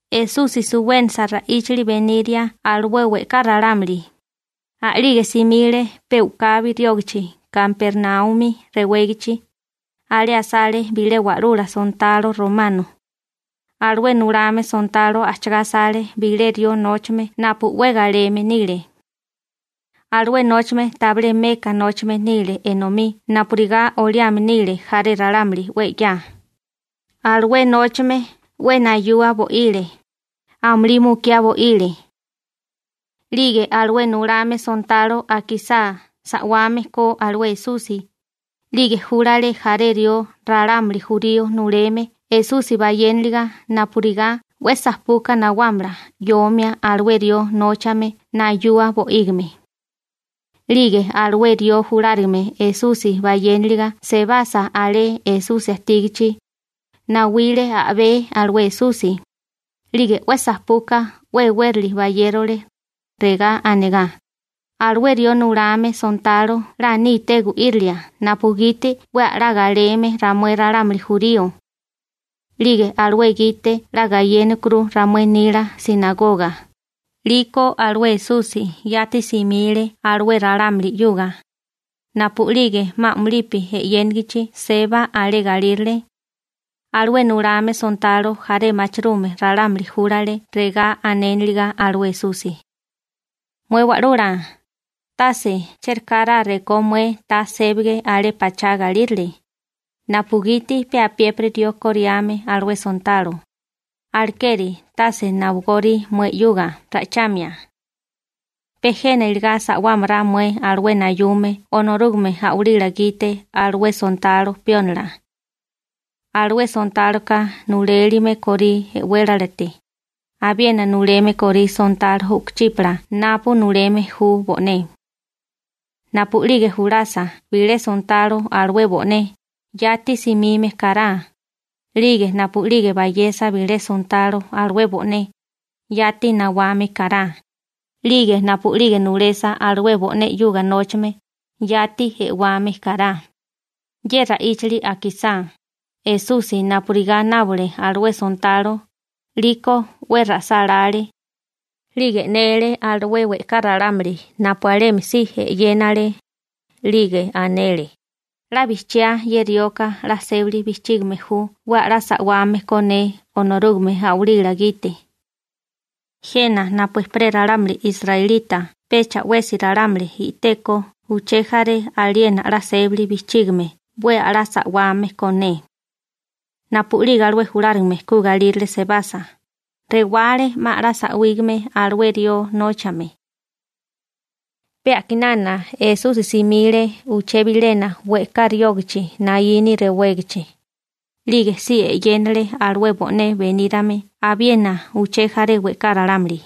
Esusi suwénasa ra'íchali beniria alué we'ká ralámuli, a'lige simile pe u'kabi riógachi Kapernaumi rewégachi. Alé asale bilé wa'lula sontalo romano. Alué nulame sontalo ajchagá asale bilé rió nóchame napu 'we galeme nile. Alué nóchame tabilé meka nóchame nile enomí napurigá oliame nile jaré ralámuli 'we 'ya. Alué nóchame 'we nayua bo'ile, amulí mukiá bo'ile. 'Lige alué nulame sontalo akisá sa'wame ko alué Esusi, 'lige júlale jaré rió ralámuli jurío nuleme Esusi bayénaliga napurigá 'we sajpuka nawámala 'yomia alué rió nóchame nayua bo'ígime. 'Lige alué rió julárigame Esusi bayénaliga sebasa alé Esusi ajtígachi, nawile a'bé alué Esusi, 'lige 'we sajpuka 'we e'wérili bayérole, regá anegá: ―Alué rió nulame sontalo 'la níté gu'írilia napugiti 'we a'lá galeme ramué ralámuli jurío. 'Lige alué gite 'la gayénarukuru ramué nila «sinagoga». 'Liko alué Esusi yati simile alué ralámuli 'yuga. Napu'lige 'ma a'mulipi e'yénigichi seba alé galírale, alué nulame sontalo jaré machirume ralámuli júlale regá anéniliga alué Esusi: ―Mué Wa'lula, tase chérekará rekó mué ta sébage alé pachá galírale, napugiti pe apiépiri rió koriame alué sontalo, alekeri tase nawagórí mué 'yuga ra'ichamia. Pe jena iligá sa'wámará mué alué nayume Onorúgame a'walila gite alué sontalo piónila. Alué sontáloka nulélime korí e'wélalate, abiena nuleme korí sontalo u'kuchípala napu nuleme ju bo'né. Napu'lige julasa bilé sontalo alué bo'né, yati simime kará, 'lige napu'lige bayesa bilé sontalo alué bo'né, yati nawame kará, 'lige napu'lige nulesa alué bo'né 'yuga nóchame, yati e'wame kará. Ye ra'íchali akisá, Esusi napurigá nábole alué sontalo, 'liko 'we ra'sálále, 'lige e'nele alué we'ká ralámuli napu alemi si e'yénale, 'lige anele: ―'La bijchiá ye rioka 'la sébili bijchígame ju 'we a'lá sa'wame ko ne Onorúgame a'walila gite. Jena napu ejperé ralámuli israelita pecha 'wesi ralámuli i'teko uché jaré aliena 'la sébali bijchígime 'we a'lá sa'wame ko ne. Napu'lige alué julárigame ku galírale sebasa, rewale 'ma a'lá sa'wígame alué rió nóchame. Pe a'kinana Esusi simile uché bilena we'ká riógachi Naíni rewégachi, 'lige si e'yénale alué bo'né benírame abiena uché jaré we'ká ralámuli.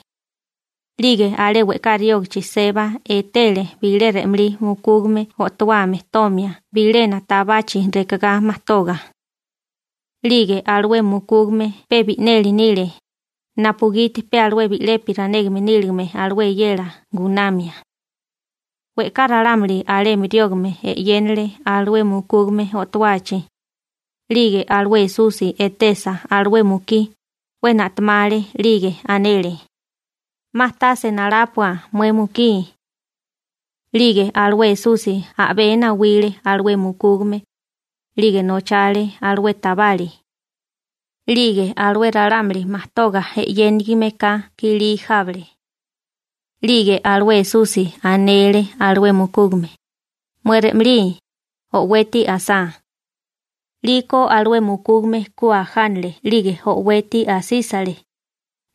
'Lige alé we'ká riógachi seba etele bilé re'malí mukúgame o'towame tomia bilena tabachi rekagá majtoga. 'Lige alué mukúgame pe bi'neli nile, napugiti pe alué bi'lepi ranégame níligame alué eyela gunamia. We'ká ralámuli alemi riógame e'yénale alué mukúgame o'towachi. 'Lige alué Esusi etesa alué mukí, 'we na'temale, 'lige anele: ―'Ma tase nalápua mué mukí. 'Lige alué Esusi a'bé nawile alué mukúgame, 'lige nochale alué tabali. 'Lige alué ralámuli majtoga e'yénigime ka kilí jábale. 'Lige alué Esusi anele alué mukúgame: ―¡Mué re'malí, o'weti asá! 'Liko alué mukúgame ku ajánale 'lige o'weti asísale,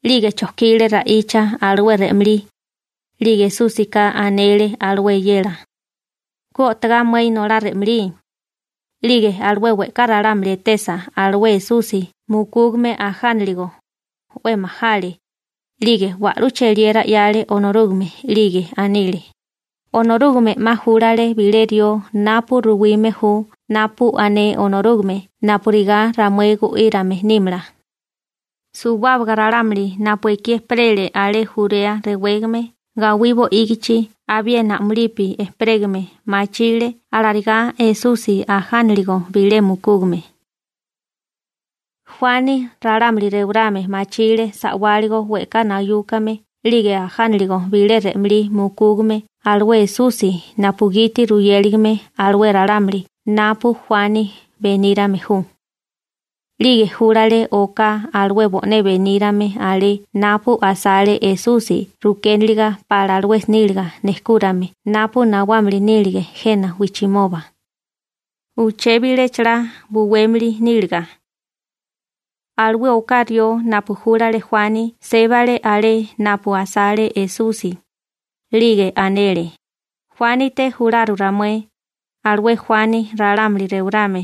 'lige chojkile ra'icha alué re'malí. 'Lige Esúsika anele alué eyela: ―Ku o'togá mué inolá re'malí. 'Lige alué we'ká ralámuli etesa alué Esusi mukúgame ajániligo, 'we majale, 'lige wa'lú cheliera 'yale Onorúgame 'lige anile: ―Onorúgame 'ma júlale bilé rió napu ruwime ju napu ané Onorúgame napurigá ramué gu'írame nímala. Suwábaga ralámuli napu ekí ejperele alé Jurea rewégame gawí bo'ígichi abiena a'mulipi ejperégame machile alarigá Esusi ajánaligo bilé mukúgame. Juani ralámuli rewarame machile sa'wáligo we'ká nayúkame 'lige ajániligo bilé re'malí mukúgame alué Esusi napugiti ruyéligame alué ralámuli napu Juani benírame ju, 'lige júlale oká alué bo'né benírame alé napu asale Esusi rukéniliga pala alué níliga nejkúrame napu nawámili nílige jena wijchimoba, uché bilé chalá buwémili níliga. Alué oká rió napu júlale Juani sébale alé napu asale Esusi, 'lige anele: ―Juánite jularu ramué, alué Juani ralámuli rewarame,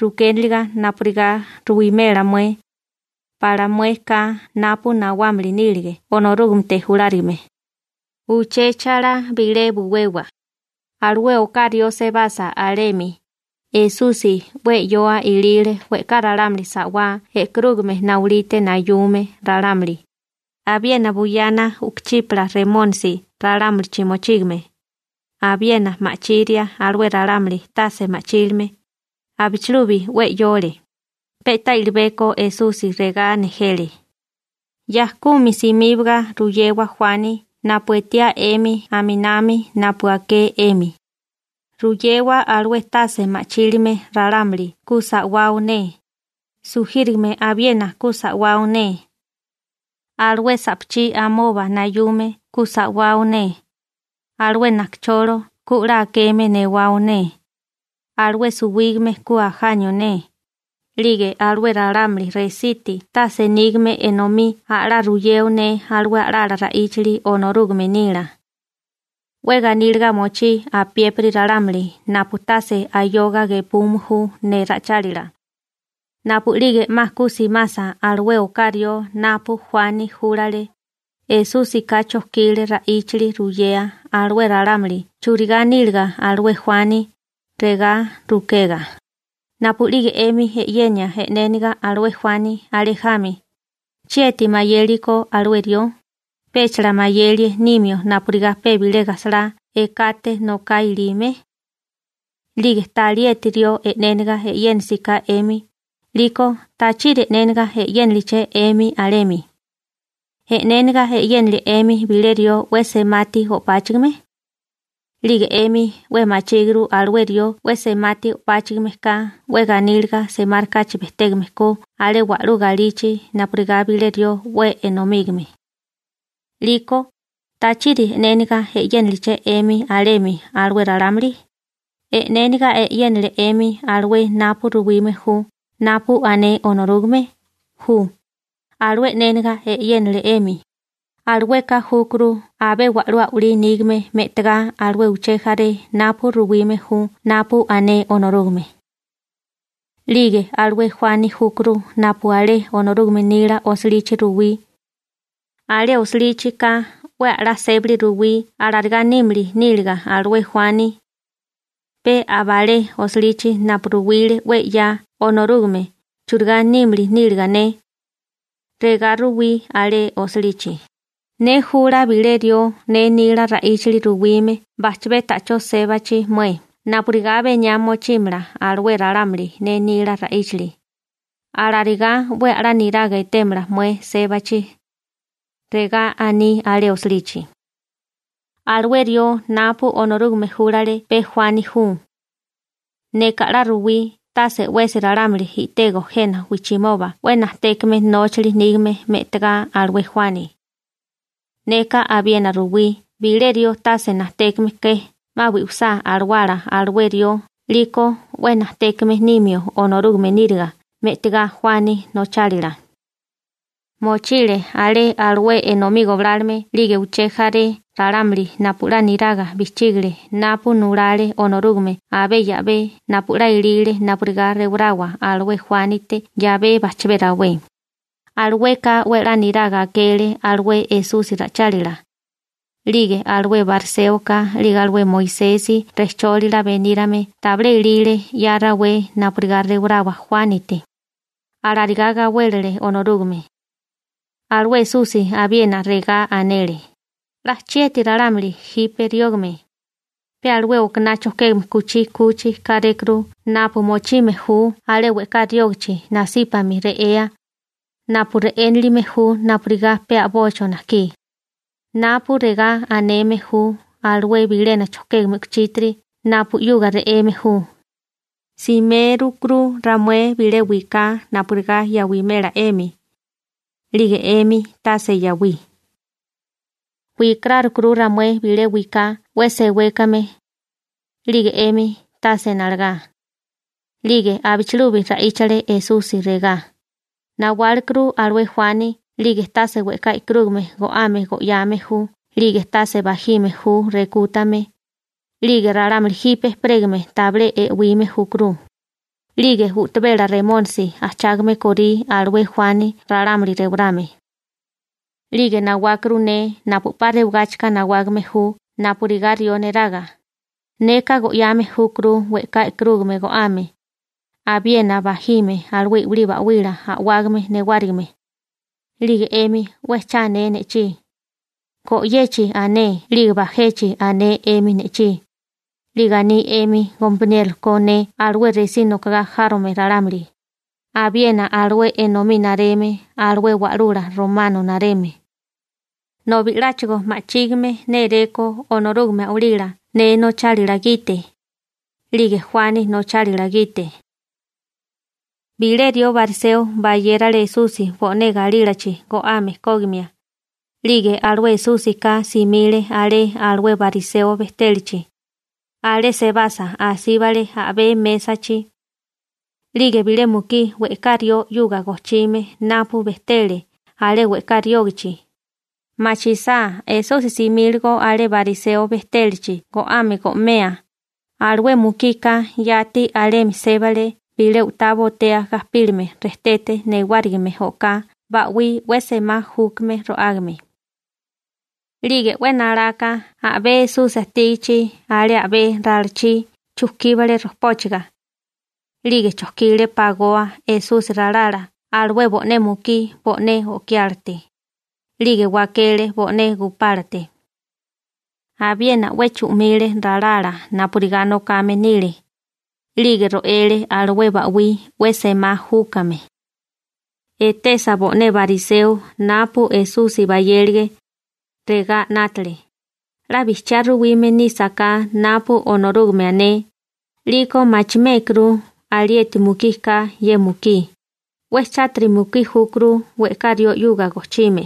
rukéniliga napurigá ruwimela mué, ¿pala mué ka napu nawámili nílige Onorúgamete julárigame? ¿Uché chalá bilé buwewa? Alué oká rió sebasa alemi, Esusi 'we 'yoa ilile we'ká ralámuli sa'wá e'karúgame naulite nayume ralámuli, abiena buyana u'kuchípala remónisi ralámulichi mochígame, abiena ma'chiria alué ralámuli tase ma'chílime. Abichilubi 'we 'yole. Pe'tá i'libeko Esusi regá nejele: ―Ya kumi simíbaga ruyewa Juani napu etiá 'emi aminami napu aké 'emi. Ruyewa alué tase ma'chílime ralámuli ku sa'wao ne, sujírigame abiena ku sa'wao ne, alué sa'pachí amoba nayume ku sa'wao ne, alué najkacholo ku 'la akeme newao ne, alué suwígame ku ajanio ne, 'lige alué ralámuli resiti tase nígame enomí a'lá ruyeo ne alué a'lala ra'íchali Onorúgame nila. 'We ganíliga mochí apiépiri ralámuli napu tase ayoga gepume ju ne ra'ichálila. Napu'lige 'ma ku simasa alué oká rió napu Juani júlale, Esúsika chojkile ra'íchali ruyea alué ralámuli churigá níliga alué Juani, regá rukega: ―Napu'lige 'emi e'yenia e'néniga alué Juani alé jami, ¿chieti mayéliko alué rió? ¿Péchala mayelie nimio napurigá pe bilé gajsalá ekate noká ilime? 'Lige ta alieti rió e'néniga e'yénisiká 'emi, 'liko ¿tachiri e'néniga e'yéniliché 'emi alemi? ¿E'néniga e'yénilie 'emi bilé rió 'we semati o'páchigime? 'Lige 'emi 'we machíguru alué rió 'we semati o'páchigime ka 'we ganíliga semárikáchi bejtégame ko alé wa'lú galichi napurigá bilé rió 'we enomígame. 'Liko ¿tachiri e'néniga e'yéniliché 'emi alemi alué ralámuli? ¿E'néniga e'yénale 'emi alué napu ruwime ju napu ané Onorúgame? Ju, alué e'néniga e'yénale 'emi, alueka júkuru abé wa'lú a'walí nígame me'tagá alué uché jaré napu ruwime ju napu ané Onorúgame. 'Lige alué Juani júkuru napu alé Onorúgame nila osilichi ruwí. Alé osilichi ka 'we a'lá sébali ruwí alarigá nímili níliga alué Juani, pe aba alé osilichi napu ruwile 'we 'ya Onorúgame churigá nímili níliga ne. Regá ruwí alé osilichi: Ne jula bilé rió ne nila ra'íchali ruwime bajchabé ta'chó sébachi mué napurigá beniá mochímala alué ralámuli ne nila ra'íchali. Alarigá 'we a'lá niraga etémala mué sébachi. Regá aní alé osilichi. › Alué rió napu Onorúgame júlale pe Juani ju. Neka 'la ruwí tase 'wesi ralámuli i'tego jena wijchimoba 'we najtékame nóchali nígame me'tagá alué Juani. Neka abiena ruwí bilé rió tase najtékame ke, 'ma bi'wisá alawala alué rió 'liko 'we najtékame nimio Onorúgame níriga me'tigá Juani nochálila. Mochile alé alué enomí goblálome 'lige uché jaré ralámuli napu 'la niraga bijchígale napu nulale Onorúgame abé 'yabé napu 'la elile napurigá rewarawa alué Juánite 'yabé bajchabé rawé, alueka 'we 'la niraga akele alué Esusi ra'ichálila. 'Lige alué bariséoka 'lige alué Moisesi rejchólila benírame tabilé elile 'ya rawé napurigá rewarawa Juánite, alarigá gawélele Onorúgame. Alué Esusi abiena regá anele: ―¡'La chieti ralámuli jipe riógame! Pe alué okaná chojkégame kuchí 'kuchi kárékuru napu mochime ju alé we'ká riógachi nasípami re'ea, napu re'énilime ju napurigá pe a'bocho najkí. Napu regá aneme ju alué bilena chojkégame kuchítiri napu 'yuga re'eme ju: Simérukuru ramué bilé wiká napurigá yawimela 'emi, 'lige 'emi tase yawí. Wikarárukuru ramué bilé wiká 'we sewékame, 'lige 'emi tase nalagá. 'Lige abichilubi ra'íchale Esusi regá: ―Nawálekuru alué Juani 'lige tase we'ká e'karúgame go'ame go'yame ju 'lige tase bajime ju rekútame, 'lige ralámuli jipe ejperégame tabilé e'wime júkuru, 'lige u'tabela remónisi ajchágame korí alué Juani ralámuli rewarame. 'Lige nawákuru ne napu 'pa rewagáchika nawágame ju napurigá rió neraga, neka go'yame júkuru we'ká e'karúgame go'ame, abiena bajime alué i'wilí ba'wila a'wágame newárigime. 'Lige 'emi 'we cha ané ne'chí, go'yechi ané, 'lige bajechi ané 'emi ne'chí, 'lige aní 'emi gompaniérola ko ne alué resí nokogá járome ralámuli, abiena alué enomí nareme alué wa'lula romano nareme. Nobi 'láchigo ma'chígime néréko Onorúgame a'walila ne nochálila gite, 'lige Juani nochálila gite. Bilé rió bariseo bayérale Esusi bo'né galílachi go'ame kógimia. 'Lige alué Esúsika simile alé alué bariseo bejtélachi, alé sebasa asíbale a'bé mésachi. 'Lige bilé mukí we'ká rió 'yuga gojchime napu bejtele alé we'ká riógachi, machisá Esusi simíligo alé bariseo bejtélachi go'ame go'mea, alué mukika yati alemi sébale bilé u'tá botea gajpílame rejtete newárigime o'ká ba'wí 'we semá júkame ro'ágame. 'Lige 'we nalaka a'bé Esusi ajtígichi alé a'bé ralachí chujkíbale rojpóchaga. 'Lige chojkile pagoa Esusi ralala alué bo'né mukí bo'né o'kiálate, 'lige wakele bo'né gupálate. Abiena 'we chu'mile ralala napurigá nokame nile, 'lige ro'ele alué ba'wí 'we semá júkame. Etesa bo'né bariseo napu Esusi bayélige, regá 'nátale: «'La bijchiá ruwime nísaká napu Onorúgame ané, 'liko machimékuru alieti mukí ka ye mukí, 'we chátiri mukí júkuru we'ká rió 'yuga gojchime.»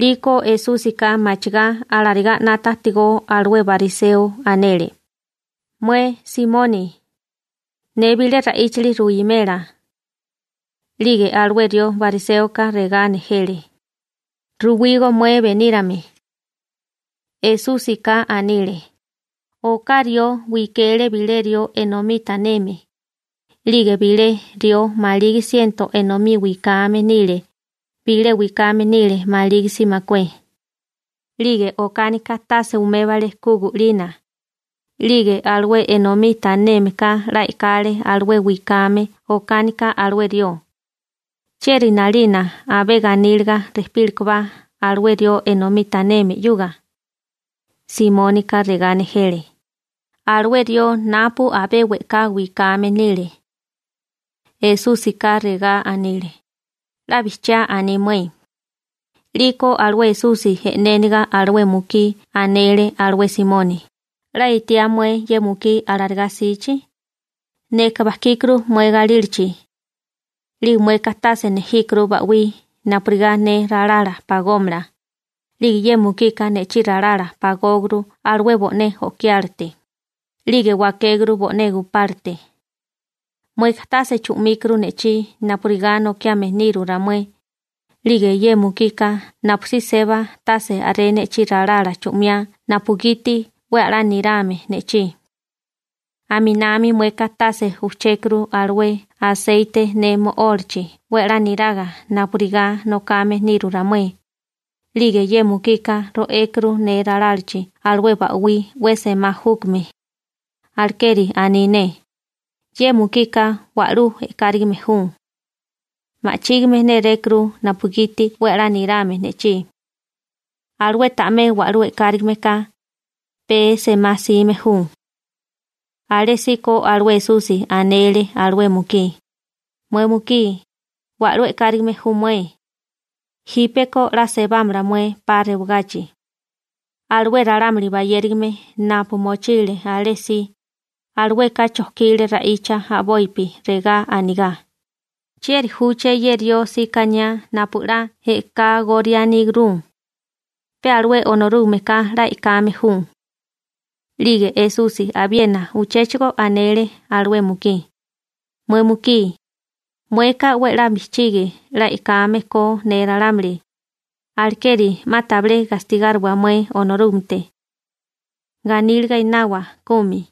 'Liko Esúsika machigá alarigá 'nata ajtigó alué bariseo anele: ―Mué Simoni, ne bilé ra'íchali ruwimela. 'Lige alué rió bariséoka regá nejele: ―Ruwígó mué benírame. Esúsika anile: ―Oká rió wikele bilé rió enomí taneme, 'lige bilé rió maligi siento enomí wikame nile, bilé wikame nile malígisa makué. 'Lige okánika tase umébale ku gu'lina. 'Lige alué enomí tanémeká 'la e'kale alué wikame okánika alué rió. ¿Chieri 'nalina abé ganíliga rejpílekobá alué rió enomí taneme 'yuga? Simónika regá nejele: ―Alué rió napu abé we'ká wikame nile. Esúsika regá anile: ―'La bijchiá aní mué. 'Liko alué Esusi e'néniga alué mukí anele alué Simoni: ―'La etiá mué ye mukí alarigá 'sichi. Neka bajkíkuru mué galílachi, 'lige mueka tase nejíkuru ba'wí napurigá ne ralala pagómala. 'Lige ye mukika ne'chí ralala pagókuru alué bo'né o'kiálate, 'lige wakékuru bo'né gupálate. Mueka tase chu'míkuru ne'chí napurigá nokiame niru ramué, 'lige ye mukika napusí seba tase a'ré ne'chí ralala chu'miá napugiti 'we a'lá nirame ne'chí. Aminami mueka tase ujchékuru alué aseite ne mo'ólachi 'we a'lá niraga napurigá nokame niru ramué, 'lige ye mukika ro'ékuru ne ralálachi alué ba'wí 'we semá júkame. Alekeri aní ne: «Ye mukika wa'lú e'kárigime ju», ma'chígime nérékuru napugiti 'we a'lá nirame ne'chí. Alué ta'mé wa'lú e'kárigime ka, pee semá 'sime ju. Alésíko alué Esusi anele alué mukí: ―Mué mukí, wa'lú e'kárigime ju mué. Jípeko 'la sebámala mué 'pa rewagachi. Alué ralámuli bayérigame napu mochile alé si, alueka chojkile ra'icha a'bopi, regá anigá: ―¿Chieri júché ye rió síkaniá napu 'la e'kágorianíguru? Pe alué Onorúgameka 'la e'kame ju. 'Lige Esusi abiena uchéchigo anele alué mukí: ―Mué mukí, mueka 'we 'la bijchigi 'la e'kame ko ne ralámuli, alekeri 'ma tabilé gastigáriwa mué Onorúgamete. Ganíliga enawa kumi.